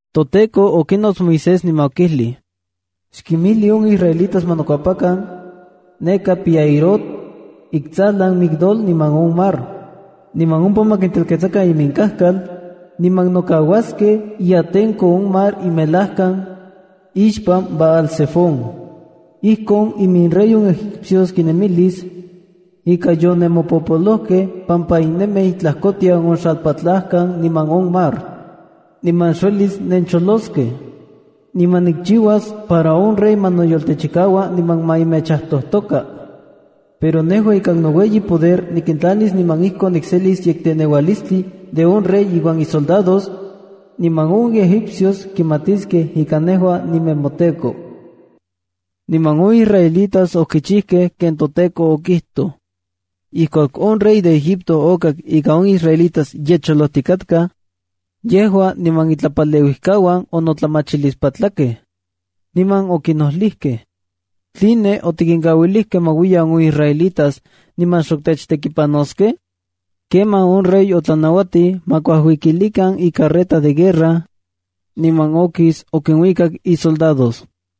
ToTEKO okinots Moisés niman okijlij: “Xkimijli on israelitas ma nokuepakan neka Pi-hahirot, intsajlan Migdol niman on mar. Niman ompa ma kintelketsakan iminkajkal, niman nokauaskej iatenko on mar imelajkan ixpan Baal-zefón. Ijkon iminrey on egipcios kinemilis ika yonemopojpolojkej pampa nennemij itlajkotian on xalpatlajkan niman on mar, niman xuelis nencholoskej. Niman nikchiuas para on rey ma noyoltechikaua niman ma mechajtojtoka. Pero nejua ikan noueyi poder nikintlanis niman ijkon nikselis yekteneualistli de on rey iuan isoldados, niman on egipcios kimatiskej ika nejua ninemoTEKO.” Niman on israelitas okichijkej ken toTEKO okijtoj. Ijkuak on rey de Egipto okak ika on israelitas ye cholojtikatkaj, yejua niman itlapaleuijkauan onotlamachilispatlakej, niman okinojlijkej: “¿Tline otikinkauilijkej ma uiyan on israelitas niman xok techtekikapanoskej?” Kemaj on rey otlanauatij ma kuajuikilikan icarreta de guerra, niman okis okinuikak isoldados.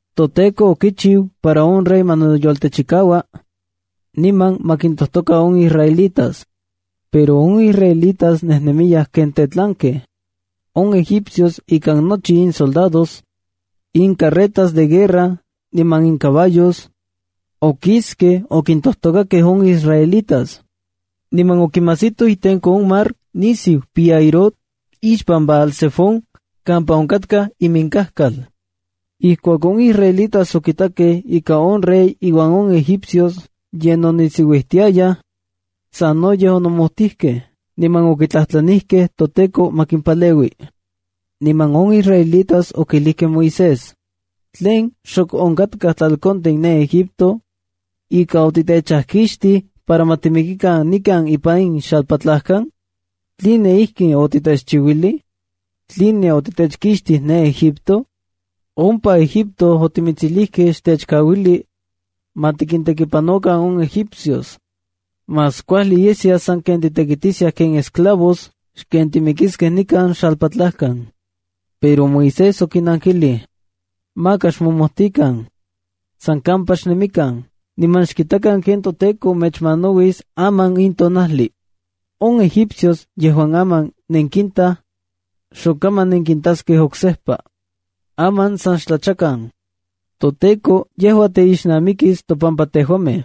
ToTEKO okichiu para on rey ma noyoltechikaua, niman ma kintojtoka on israelitas, pero on israelitas nejnemiyaj ken tetlankej. On egipcios ikan nochi insoldados, incarretas de guerra niman incaballos, okiskej okintojtokakej on israelitas, niman okinmajsitoj itenko on mar nisiu Pi-hahirot ixpan Baal-zefón kampa onkatkaj iminkajkal. Ijkuak on israelitas okitakej ika on rey inuan on egipcios ye nonisiuijtiayaj, sanoyej onomojtijkej niman okitlajtlanijkej toTEKO ma kimpaleui. Niman on israelitas okijlijkej Moisés: —¿Tlen xok onkatkaj tlalkontin ne Egipto ika otitechkixtij para ma timikikan nikan ipan in xalpatlajkan? ¿Tline ijkin otitechchiuilij? ¿Tline otitechkixtij de Egipto? Ompa Egipto otimitsijlijkej xtechkauili ma tikintekipanokan on egipcios. Más kuajli yeskia sanken titekitiskiaj ken esclavos xken timikiskej nikan xalpatlajkan. Pero Moisés okinnankilij: —Maka xmomojtikan. San kampa xnemikan, niman xkitakan ken toTEKO mechmanauis aman in tonajli. On egipcios yejuan aman nenkintaj, xokaman nenkintaskej oksejpa. Aman san xtlachakan. ToTEKO yejua teixnamikis topampa tejuamej.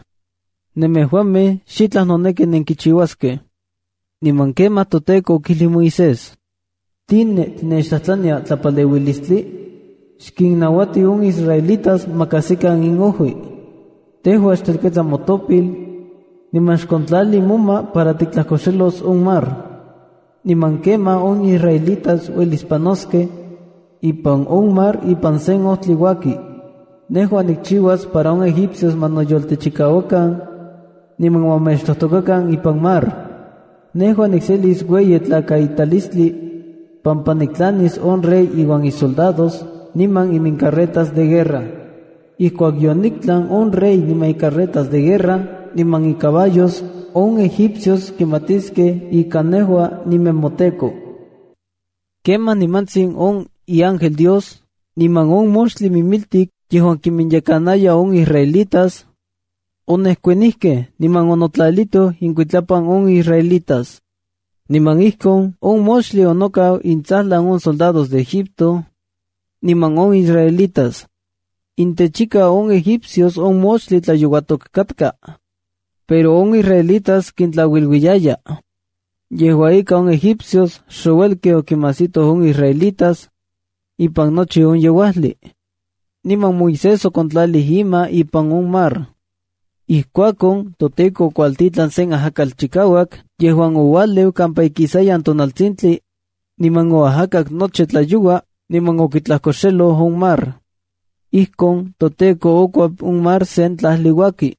Nemejuamej xitlaj noneki nenkichiuaskej. Niman kemaj toTEKO okijlij Moisés: —¿Tline tinechtlajtlania tlapaleuilistli? ¡Xkinminnauati on israelitas ma kajsikan inojui! Tejua xtelketsa motopil niman xkontlali moma para tiktlajkoxelos on mar, niman kemaj on israelitas uelis panoskej ipan on mar ipan sen ojtli uaki. Nejua nikchiuas para on egipcios ma noyoltechikauakan, niman ma mechtojtokakan ipan mar. Nejua nikselis ueyi tlakaitalistli pampa niktlanis on rey iuan isoldados niman imincarretas de guerra. Ijkuak yoniktlan on rey niman icarretas de guerra niman icaballos, on egipcios kimatiskej ika nejua ninemoTEKO. Kemaj nimantsin on iángel Dios niman on moxtli mimiltik yejuan kiminyekanaya on israelitas, onejkuanijkej niman onotlalitoj inkuitlapan on israelitas. Niman ijkon on moxtli onokau intsajlan on soldados de Egipto niman on israelitas. Intechika on egipcios on moxtli tlayouatok katka, pero on israelitas kintlauiluiyaya. Yejua ika, on egipcios xouelkej okimajsitoj on israelitas ipan nochi on yeuajli. Niman Moisés okontlalij ima ipan on mar. Ijkuakon toTEKO okuajtitlan sen ajakatl chikauak yejuan oualeu kampaka ikisayan tonaltsintli, niman oajakak nochi tlayoua, niman okitlajkoxeloj on mar. Ijkon toTEKO okikuep on mar sen tlajli uaki.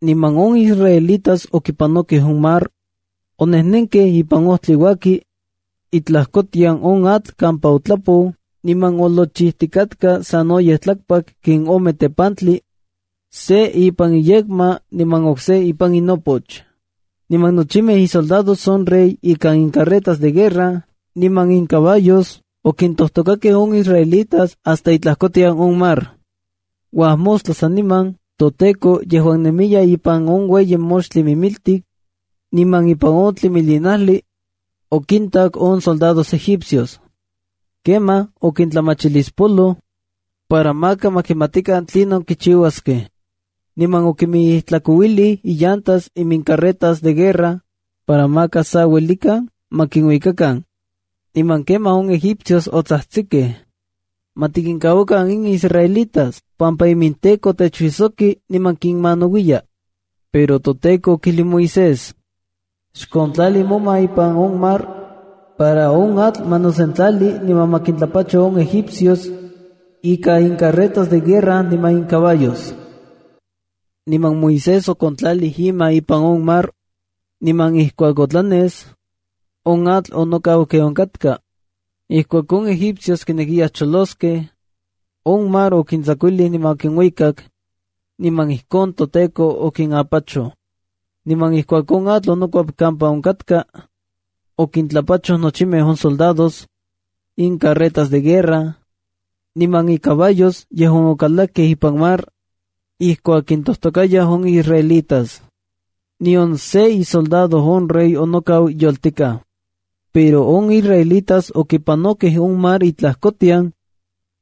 Niman on israelitas okipanokej on mar, onejnenkej ipan ojtli uaki itlajkotian on atl kampa otlapou niman olochijtikatka sanoyej tlakpak ken ome tepantli, se ipan inyekma niman okse ipan inopoch. Niman nochimej isoldados on rey ikan incarretas de guerra niman incaballos okintojtokakej on israelitas hasta itlajkotian on mar. Uajmostla saniman, toTEKO yejuan nemiya ipan on ueyi moxtli mimiltik niman ipan on tlimilinajli, okintak on soldados egipcios. Kemaj okintlamachilispoloj para maka ma kimatikan tlinon kichiuaskej. Niman okimijijtlakouilij illantas imincarretas de guerra para maka sa uelikan ma kuikakan. Niman kemaj on egipcios otsajtsikej: —¡Ma tikinkauakan in israelitas pampa iminTEKO techuijsoki niman kinmanauiya! Pero toTEKO okijlij Moisés: —Xkontlali moma ipan on mar para on atl ma nosentlali niman ma kintlapacho on egipcios ika incarretas de guerra niman incaballos. Niman Moisés okontlalij ima ipan on mar. Niman ijkuak otlanes, on atl onokau ken onkatka. Ijkuak on egipcios kinekiyaj choloskej, on mar okintsakuilij niman okinuikak, niman ijkon toTEKO okinapachoj. Niman ijkuak on atl onokuep kampa onkatka, okintlapachoj nochimej on soldados, incarretas de guerra, niman incaballos yejuan okalakej ipan mar ijkuak kintojtokayaj on israelitas. Nion se isoldado on rey onokau yoltikaj. Pero on israelitas okipanokej on mar itlajkotian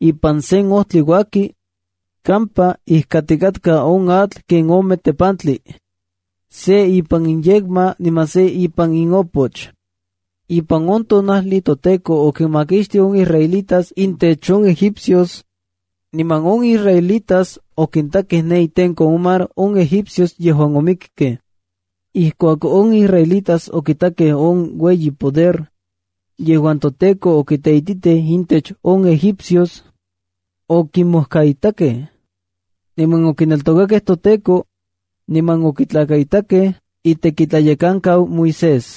ipan sen ojtli uaki kampa ijkatikatka on atl ken ome tepantli, se ipan inyekma niman se ipan inopoch. Ipan on tonajli toTEKO okinmakixtij on israelitas intech on egipcios, niman on israelitas okintakej ne itenko on mar on egipcios yejuan omikej. Ijkuak on israelitas okitakej on ueyi poder yejuan toTEKO okiteititij intech on egipcios, okimojkaitakej, niman okineltokakej toTEKO niman okitlakaitakej itekitlayekankau Moisés.